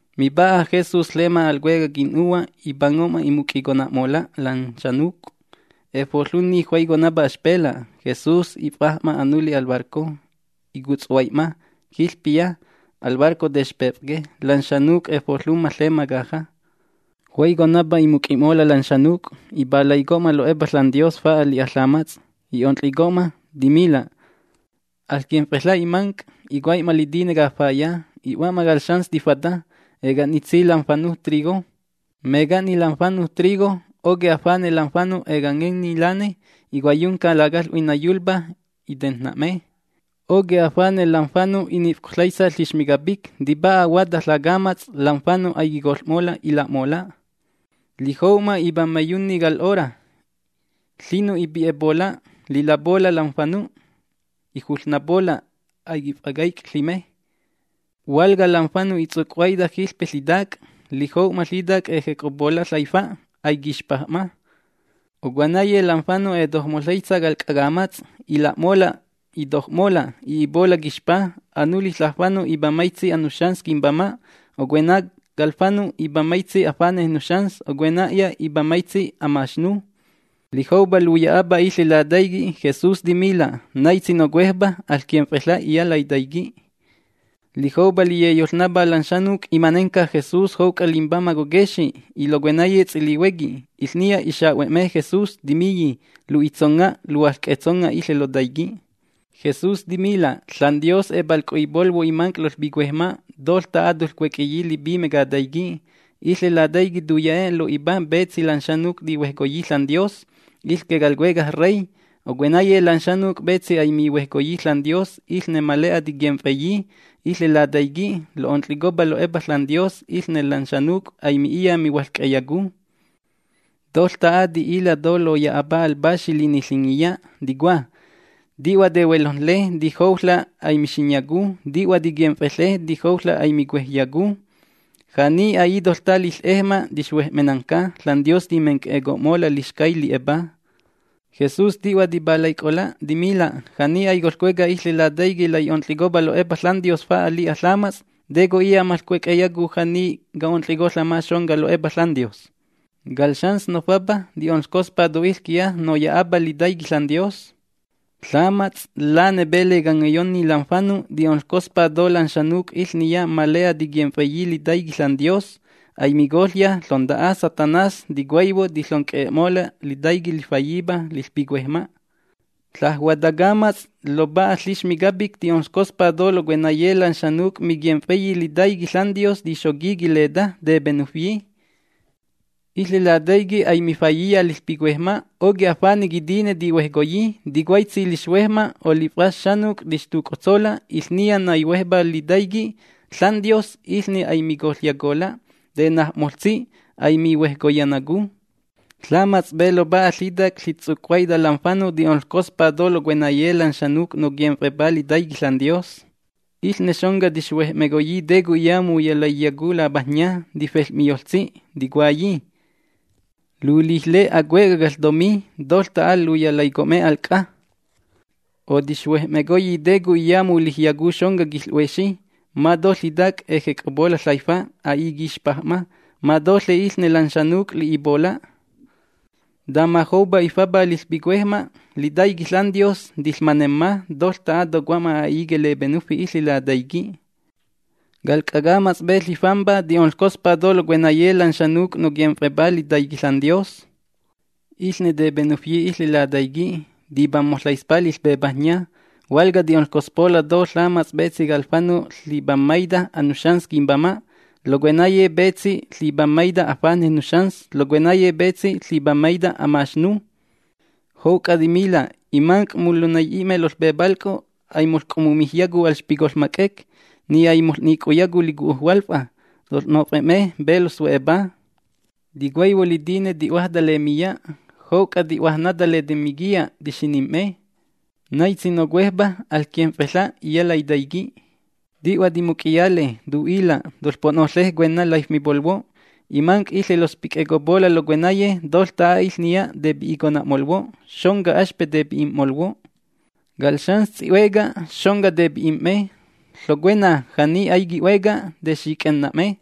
Mipa'a Jesús ƚema al cuecaj quin'nuhua', ipango'ma imuc'icona'mola' lan xanuc'. Efoƚunni juaiconapa axpela'. Jesús if'aj'ma anuli al barco. Icutshuai'ma jiƚpiya. Al barco texpef'que. Lan xanuc' efoƚumma ƚema caja. Juaiconapa imuc'i'mola' lan xanuc'. Ipalaico'ma lo'epa ȽanDios fa'a li'a ƚamats'. I'onƚico'ma. Timila': ―Aƚquimf'eƚa' imanc': ’Icuai'ma litine cafaya, i'hua'ma cal xans tifata. Eca'nitsi lam fanuj trigo. Meca'ni lam fanuj trigo, oquej afane' lam fanu' ecangenni lane. Icuaiyunca lacaƚ'hui naiyulpá, itejn‑na'me. ’Oquej afane' lam fanu' i'nif'coƚaitsa ƚixmi capic, tipa'a ahuata ƚacamats'. Lam fanu' aiquicoƚ'mola' ila'mola'. Lijou'ma ipammaiyunni cal 'ora, ƚinu' ipi'epola' lilapola' lam fanu'. Ijuƚnapola'. Aiquif'acaic' ƚime. ’Hualca lam fanu' itsuc'huaita jiƚpe ƚitac'. Litoj'ma ƚitac', ejec'opola' laifa'. Aiquixpaj'ma. ’Ocuenaye lam fanu' etojmoƚaitsa cal c'a camats'. Ila'mola', itoj'mola', i'ipola' quixpa. Anuli ƚajfanu' ipammaitsi anuxans quimbama', ocuena cal fanu' ipammaitsi afanej nuxans, ocuena'ya ipammaitsi amaxnu. Lijoupa luya'apa iƚe litaiqui', Jesús timila': ―Naitsi nocuejpa, aƚquimf'eƚa' iya' laitaiqui'. Lijoupa liyeyoƚnapá lan xanuc', imanenca Jesús jouc'a limbamaj coquexi' y locuenaye ts'ilihuequi. Iƚniya ixa'hue'me Jesús, timiyi: ―Lu'itsonga', luhuaƚc'e'etsonga' iƚe lotaiqui'. Jesús timila': ―ȽanDios epalc'o'ipolhuo' imanc' loƚpicuejma', toƚta'a toƚcuec'eyi lipime cataiqui'. Iƚe lataiqui' tuya'e' lo'ipa petsi lan xanuc' tihuejcoyi ȽanDios, iƚque cal Cuecaj Rey. Ocuenaye lan xanuc' petsi aimihuejcoyi ȽanDios, iƚne ma le'a tiquimf'eyi. Iƚe lataiqui' lo'onƚicopa lo'epa ȽanDios iƚne lan xanuc' aimi'iya mihuaƚc'eyacu. Toƚta'a ti'iƚa' to loya'apa al Paxi Liniƚingiya, ticua: Ti'hua tehuelojnle, tijouƚa' aimixinyacu. Ti'hua tiquimf'eƚe, tijouƚa' aimicuejyacu. Ja'ni a'i toƚta'a liƚ'ejma' tixhuej'menacu, ȽanDios timenc'e'eco'mola' lixcay li'epá. Jesús ti'hua tipalaic'ola', timila': ―Ja'ni aicoƚcueca iƚe laitaiqui' lai'onƚicopa lo'epa ȽanDios fa'a li'a ƚamats', ¿te co'iya moƚcuec'eyacu ja'ni ca'onƚico'ma xonca lo'epa ȽanDios? ’Cal xans nofapa ti'onƚcospa to iƚquiya noya'apa litaiqui' ȽanDios. Ƚamats' lane pe lecangeyonni lam fanu' ti'onƚcospa to lan xanuc' iƚniya ma le'a tiquimf'eyi litaiqui' ȽanDios. Aimicoƚya ƚonta'a Satanás. Ticuaihuo, tiƚonc'e'e'mola' lataiqui' lifayipa liƚpicuejma'. ’Ƚaj huata ƚacamats' ƚopa'a ƚixmi capic ti'onƚcospa to locuenaye lan xanuc' miquimf'eyi litaiqui' ȽanDios tixoqui quileta tepenufyi. Iƚe Lataiqui' aimifayiya liƚpicuejma', oquej fanej quitine tihuejcoyi. Ticuaitsi lixhuejma', o liƚf'as xanuc' tixtuc'ontsola' iƚniya naihuejpá litaiqui' ȽanDios, iƚne aimicoƚyacola', tenajna'moƚtsi, aimihuejconayacu. ’Ƚamats' pe ƚopa'a ƚitac' litsuc'huaita lam fanu' ti'onƚcospa to locuenaye lan xanuc' noquimf'epá litaiqui' ȽanDios. Iƚne xonca tixhuej'mecoyi te co'iya muyalaiyacu lapajnya. Tifel'miyoƚtsi, ticuayi: “Lulijle acuecaj caƚtomi. Toƚta'a luyalaico'me al c'a.” O tixhuej'mecoyi te co'iya mulijyacu xonca quiƚ'huexi. Ma to ƚitac' ejec'opola' ƚaifa', a'i quixpaj'ma, ma toƚe iƚne lan xanuc' li'ipola'. Tama joupa ifapa liƚpicuejma' litaiqui' ȽanDios, tiƚmanemma toƚta'a, tocomma a'i quilepenufi iƚe lataiqui'. ’Cal c'a camats' pe lifampa ti'onƚcospa to locuenaye lan xanuc' noquimf'epá litaiqui' ȽanDios. Iƚne tepenufyi iƚe lataiqui', tipammoƚaispa liƚpepajnya. Hualca ti'onƚcospa to ƚamats' petsi cal fanu' ƚipammaita anuxans quimbama', locuenaye petsi ƚipammaita afanej nuxans, locuenaye petsi ƚipammaita amaxnu. Jouc'a timila': ―Imanc' molunai'i'me loƚpepalc'o', aimoƚc'ommumijyacu alxpicoƚma c'ec, ni aimoƚ'nicoyacu licu'u hualfa. Toƚ'nof'e'me pe loƚxu'epa. Ticuaihuo litine ti'huájta lemiya, jouc'a ti'huájnata letemiquiya, tixinim'me. ’Naitsi nocuejpa, aƚquimf'eƚa' iya' laitaiqui'. Ti'hua timuc'iyale, tu'ila': ―Toƚpo'noƚe cuenna laifmipolhuo': Imanc' iƚe loƚspic'ecopola' locuenaye, toƚta'a iƚniya tepi'icona'molhuo'. Xonca axpe' tepi'im'molhuo'. Cal xans ts'i'hueca, xonca tepi'im'me. Ƚocuena, ja'ni aiqui'hueca, texic'ena'me.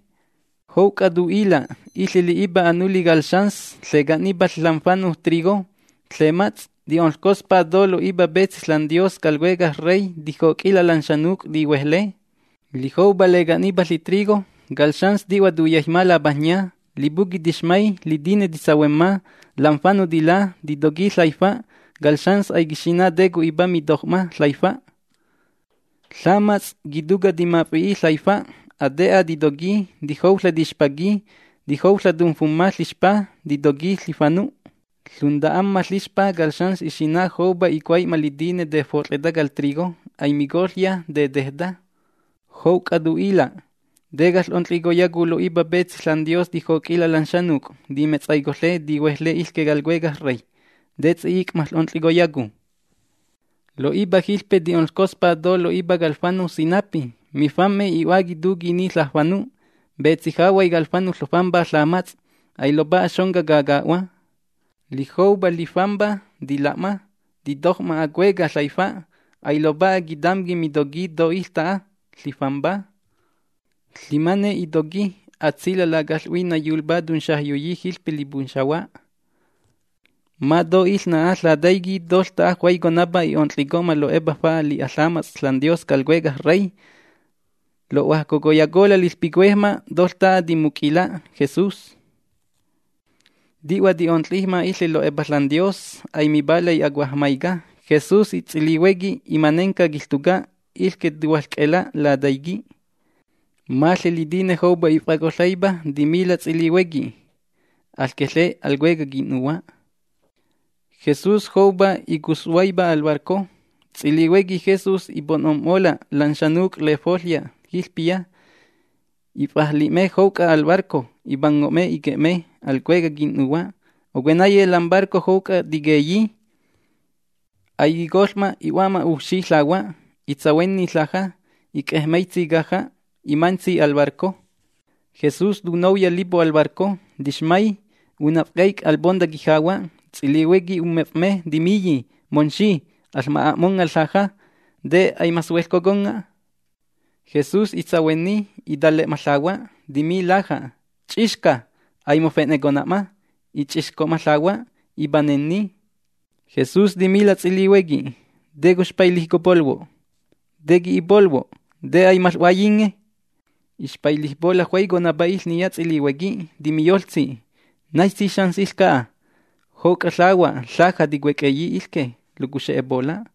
Jouc'a tu'ila': ―Iƚe li'ipa anuli cal xans ƚeca'nipa lam fanuj trigo ƚemats', ti'onƚcospa to lo'ipa petsi ȽanDios cal Cuecaj Rey tijoc'ila' lan xanuc' tihuejle. Lijoupa leca'nipa ƚitrigo, cal xans ti'hua tuyaijma lapajnya. Lipuqui' tixmay, litine titsahuemma, lam fanu' tilá, titoqui ƚaifa'. Cal xans aiquixina' te co'ipa mitoj'ma ƚaifa'. Ƚamats' quituca' timaf'i'i' ƚaifa'. Ate'a titoqui, tijouƚa' tixpaqui, tijouƚa' tumfumma lixpa, titoqui ƚifanu'. Lunta'amma lixpa cal xans ixina' joupa icuai'ma litine tefot'ƚeta cal trigo. Aimicoƚya, tetejta. Jouc'a tu'ila': ―¿Te caƚ'onƚicoyacu lo'ipa petsi ȽanDios tijoc'ila' lan xanuc' timetsaicoƚe, tihuejle iƚque cal Cuecaj Rey? ¿Te ts'i'ic' maƚ'onƚicoyacu? ’Lo'ipa jiƚpe ti'onƚcospa to lo'ipa cal fanu' sinapí. Mifam'me, i'huáqui tuquini ƚajfanu'. Petsi jahuay cal fanu' ƚofampa ƚamats', ailopa'a xonca caca'hua. Lijoupa lifampa tila'ma, titoj'ma acueca' ƚaifa'. Ailopa'a quitamqui mitoqui to iƚta'a lifampa. Ƚimané itoqui, atsila'. Lacaƚ'hui naiyulpá tunxajyoyi jiƚpe lipunxahua. Ma to iƚna'a ƚataiquí toƚta'a juaiconapa i'onƚico'ma lo'epa fa'a li'a ƚamats' ȽanDios cal Cuecaj Rey. Lo'huajcocoyacola' liƚpicuejma' toƚta'a timuc'ila' Jesús. Ti'hua ti'onƚijma iƚe lo'epa ȽanDios. Aimipalay acuajmaica. Jesús y ts'ilihuequi limanenca quiƚtuca', iƚque tuhuaƚc'e'ela' lataiqui'. Maƚe litine joupa if'acoƚaipa timila' ts'ilihuequi: ―Aƚqueƚe al cuecaj quin'nuhua'. Jesús joupa icutshuaipa al barco. Ts'ilihuequi Jesús ipo'nom'mola' lan xanuc' lefoƚya jiƚpiya, if'ajli'me jouc'a al barco. Ipango'me iquie'me al cuecaj quin'nuhua'. Ocuenaye lam barco jouc'a tiquieyi. Aiquicoƚ'ma, i'hua'ma ujfxi ƚahua'. Itsahuenni laja', ic'ejmaitsi caja', imantsi al barco. Jesús tunouya lipo al barco. Tixmay, unaf'caipa al ponta quijahua'. Ts'ilihuequi ummef'me, timiyi: ―Momxi, aƚma'a'monga' laja'. ¿Te aimaƚsueƚcoconga'? Jesús itsahuenni, itale'ma ƚahua', timi laja': ―Ch'ixca. Aimofe'necona'ma. I‑ch'ixco'ma ƚahua'. Ipanenni. Jesús timila' ts'ilihuequi: ―¿Te coxpailijcopolhuo'? ¿Te qui'ipolhuo'? ¿Te aimaƚ'huaiyinge? Ixpailijpola' juaiconapa iƚniya ts'ilihuequi. Timiyoƚtsi: ―¿Naitsi xans iƚca'a? ¡Jouc'a ƚahua', ƚaja ticuec'eyi iƚque locuxe'epola'!